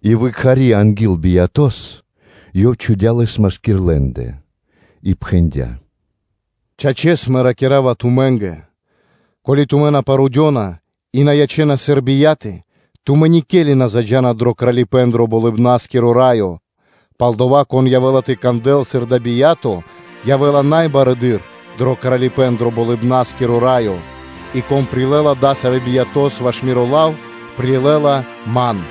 И выкхари анги́л биято́с (чхаворэс), Ёв чхудя́ лэс машки́р лэ́ндэ, и пхэндя́: “Чачэс, Мэ ракира́ва тумэ́нгэ: ко́ли тумэ́ на парудёна и на ячэ́на сыр бияты, тумэ́ никели на заджа́на дро Кралипэ́н дро Болыбна́скиро Раё. Палдова́, кон тыкнякирэла пэс сыр одова́ явэ́ла бия́то, явэ́ла най барэды́р дро Кралипэ́н дро Болыбна́скиро Раё, и кон прилэ́ла адасавэ́ биято́с ваш Миро лав, прилэ́ла Ман.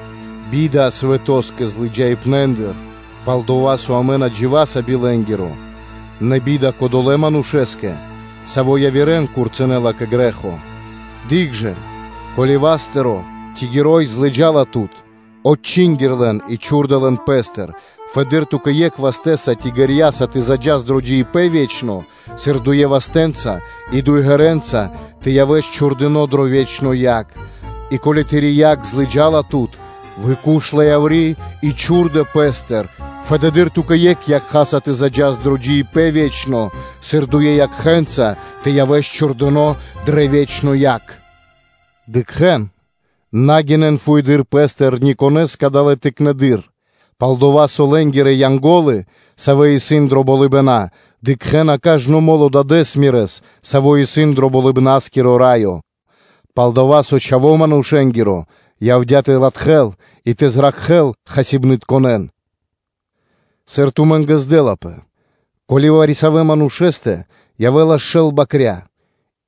Бида свэтоскэ злыджаибнэндыр! Пал-дова́ со амэ на дживаса би лэ́нгиро, нэ би́да кодолэ́ манушэ́скэ, саво́ явирэ́н тырдэла кэ грэ́хо! Дыкх жа, ко́ли васт тыро́ ци ґэро́й тыри́ злыджала тут, отчингир лэн и чхурдэ лэн пэ́стыр; фэды́р ту́кэ екхэ вастэ́са ци ґэрьяса тэ заджас дро джиибэ́н ве́чно, сыр дуе вастэ́нца и дуе ґэрэ́нца тэ явэс чхурдыно́ дро ве́чно яг. И ко́ли тыри́ якх злыджала тут, куш яври́ ла и чхурдэ пэ́стыр: фэды́р ту́кэ екхэ якхаса тэ заджас дро джиибэ́н ве́чно, сыр дуе якхэ́нца тэ явэс чхурдыно́ дрэ ве́чно яг. Дыкхэ́н, на дыкхэ́н вучипна́стыр ни пэ конэ́стэ кадалэ́ тыкнэндыр: пал-дова́ со лэ́нгирэ Янго́лы, савэ́ исын дро болыбэна, дыкхэ́на кажно мо́ло Дадэ́с Мирэс, Саво́ исын дро Болыбна́скиро Раё. Палдава́ со Чхаво́ Манушэ́нгиро явдя́ тэ латхэл, и тэ зракхэ́л хасибнытконэн. Сыр тумэ́нгэ здэлапэ? Ко́ли вари-савэ́ манушэ́стэ явэ́лас шэл бакря́,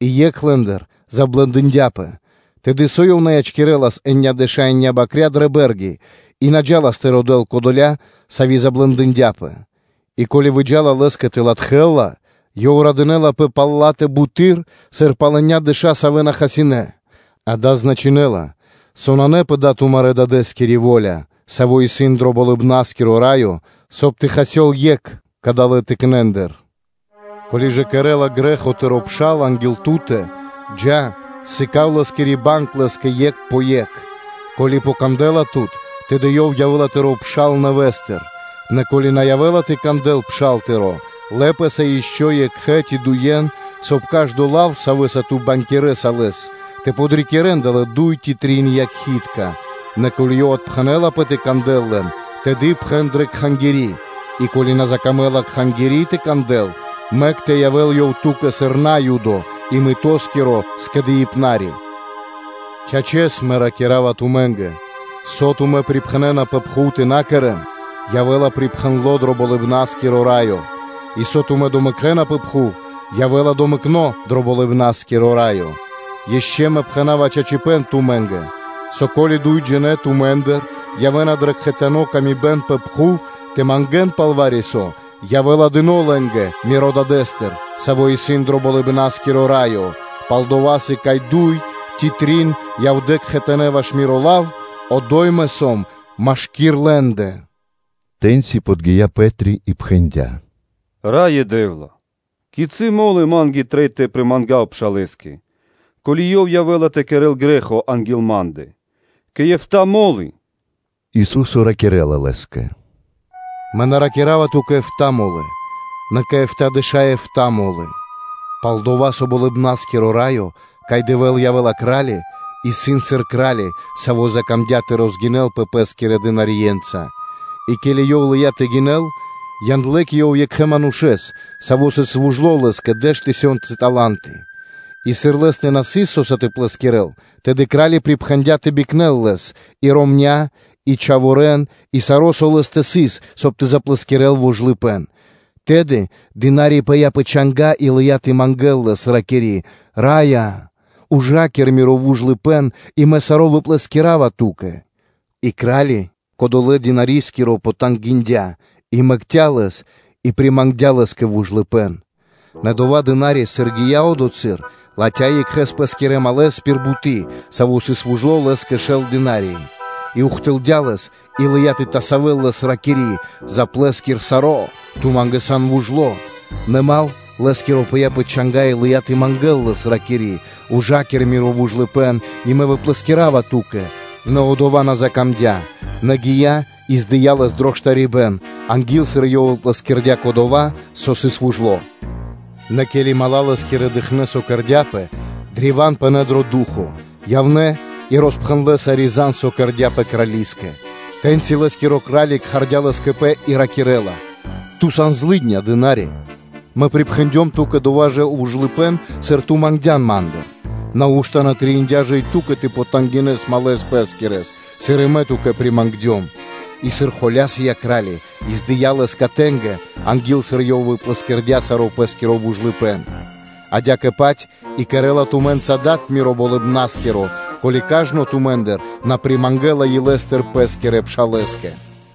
и екх лэ́ндыр заблэндындяпэ, тэды со ёв на ячкирэлас енядэша еня́ (биекхэ́скиро шэл) бакря́ дрэ бэ́рги, и на джа́лас тэ родэ́л кодоля, сави́ заблэндындяпэ? И ко́ли выджа́ла лэ́скэ тэ латхэл ла, ёв радынэ́лапэ пал ла́тэ бутэды́р, сыр пал енядэша енендэ, савэ́ на хасинэ́. Дава́ значынэ́ла, со нанэ пэ дава́ тумарэ́ Дадэ́скири во́ля, Саво́ исын дро Болыбна́скиро Раё, соб (кай) тэ хасёл екх кадалэ́ тыкнэндыр. Ко́ли ж кэрэ́ла грэ́хо тыро́ пшал анги́л ту́тэ, джа́, сыка́в лэ́скири банг лэ́скэ екх пэ екх. Ко́ли ёв кандэ́ла тут, тэды ёв явэ́ла тыро́ пшал нэвэ́стыр. Нэ ко́ли на явэ́ла тэ кандэл пшал тыро́, лэ пэ́са ишчо (инкэ́) екхэ́с ци дуе́н, соб (кай) кажно лав, савэ́са ту бангякирэса Лэс, тэ чхувэ́н зор адалэ́ дуй ци трин якхи́тка. Нэ ко́ли ёв отпхэнэлапэ тэ кандэл лэн, тэды пхэн дрэ Кхангири́; и ко́ли на закамэ́ла Кхангири́ тэ кандэл, мэк тэ явэ́л ёв ту́кэ сыр Наюдо и мытоскиро скэдыибнари. Чачэс, Мэ ракира́ва тумэ́нгэ, со тумэ́ припхэнэна пэ пхув тэ на кэрэ́н, явэ́ла припхэндло дро Болыбна́скиро Раё; и со тумэ́ домэкэна пэ пхув, явэ́ла домэкно дро Болыбна́скиро Раё. Ишчо Мэ пхэна́ва чачипэ́н тумэ́нгэ, со, ко́ли дуйджинэ́ тумэ́ндыр явэ́на дрэ кхэтаны́ годы́ пэ пхув тэ мангэ́н пал вари-со, явэ́ла дыно́ лэ́нгэ Мирэ́ Дадэ́стыр, Саво́ исын дро Болыбна́скиро Раё. Пал-дова́ со, кай дуй ци трин явнэ́ кхэтанэ́ ваш Миро лав, одо́й Мэ сом машки́р лэ́ндэ.” Тэ́ньци подги́я Пэ́три и пхэндя́: “Раё Дэ́вла, кицы́ мо́лы ма́нгэ трэй тэ примангав пшалэ́скэ, ко́ли ёв явэ́ла тэ кэрэ́л грэ́хо анги́л ма́ндэ? Кэ эфта́ (кэ битринэ́нгиро дэш) мо́лы?” Ису́со ракирэ́ла Лэ́скэ: “Мэ на ракира́ва ту́кэ эфта́ мо́лы, нэ кэ эфтадэша́ эфта́ мо́лы. Пал-дова́ со Болыбна́скиро Раё, кай Дэвэ́л явэ́ла Кра́ли, исын сыр кра́ли, саво́ закамдя́ тэ розгинэлпэ пэ́скирэ писхарье́нца. И ке́ли ёв лыя́ тэ гинэл, яндлэ́ кэ ёв екхэ манушэ́с, саво́ сыс вужло лэ́скэ дэш тысёнцы тала́нты. И сыр лэ́стэ на сыс со́са тэ плэскирэл, тэды кра́ли припхэндя́ тэ бикнэл лэс, и ромня́ и чхаворэ́н, и саро́, со лэ́стэ сыс, соб (кай) тэ заплэскирэл вужлыпэ́н. Тэды дына́ри пыя́ пэ чанга́ и лыя́ тэ мангэ́л лэс, ракири́: “Раё! ‘Ужакир миро вужлыпэ́н, и мэ саро́ выплэскирава ту́кэ.” И кра́ли, кодолэ́ писхарискиро, потангиндя и мэкця́ лэс и примангдя лэ́скэ вужлыпэ́н. Нэ адова писха́ри, сыр гия́ одотхы́р, латхя́ екхэ пэ́скирэ малэс пир буты́, саво́ сыс вужло лэ́скэ шэл динарии. И ухтылдя лэс и лыя́ тэ тасавэл лэс, ракири́: ‘Заплэскир саро́, со ту сан вужло.’ Нэ дру́го (мал) лэ́скиро пыя́ пэ чанга́ и лыя́ тэ мангэ́л лэс, ракири́: ‘Ужакир миро вужлыпэ́н и мэ выплэскирава ту́кэ.’ Нэ одова́ на закамдя́, нэ гия́ и здыя лэс дро штарибэ́н, анги́л, сыр ёв выплэскирэла кодова́, со сыс вужло. Нэ ке́ли мала́ лэ́скирэ дыкхнэ́, со кэрдя́пэ, древа́н пынэ́ дро ду́хо (фа́но), явнэ́ и роспхэндлэ́ сари́ зан (звесь), со кэрдя́пэ, крали́скэ. Тэ́ньци лэ́скиро кра́ли кхардя́ лэс кэ пэ и ракирэ́ла: ‘Ту сан злыдня писха́ри, Мэ примангдём ту́кэ дова́ вужлыпэ́н, сыр ту мангдян ман; нау́што на трэиндя́ ж и ту́кэ тэ потангинэс друго́с (малэ́с) пэ́скирэс, сыр и мэ ту́кэ примангдём?’ И сыр холя́сыя кра́ли, и здыя лэс катэнгэ, анги́л, сыр ёв выплэскирэла саро́ пэ́скиро вужлыпэ́н. Адя́кэ-паць и кэрэ́ла тумэ́нгэ Дад Миро Болыбна́скиро, ко́ли кажно тумэ́ндыр на примангэла илэ́стыр пэ́скирэ пшалэ́скэ.”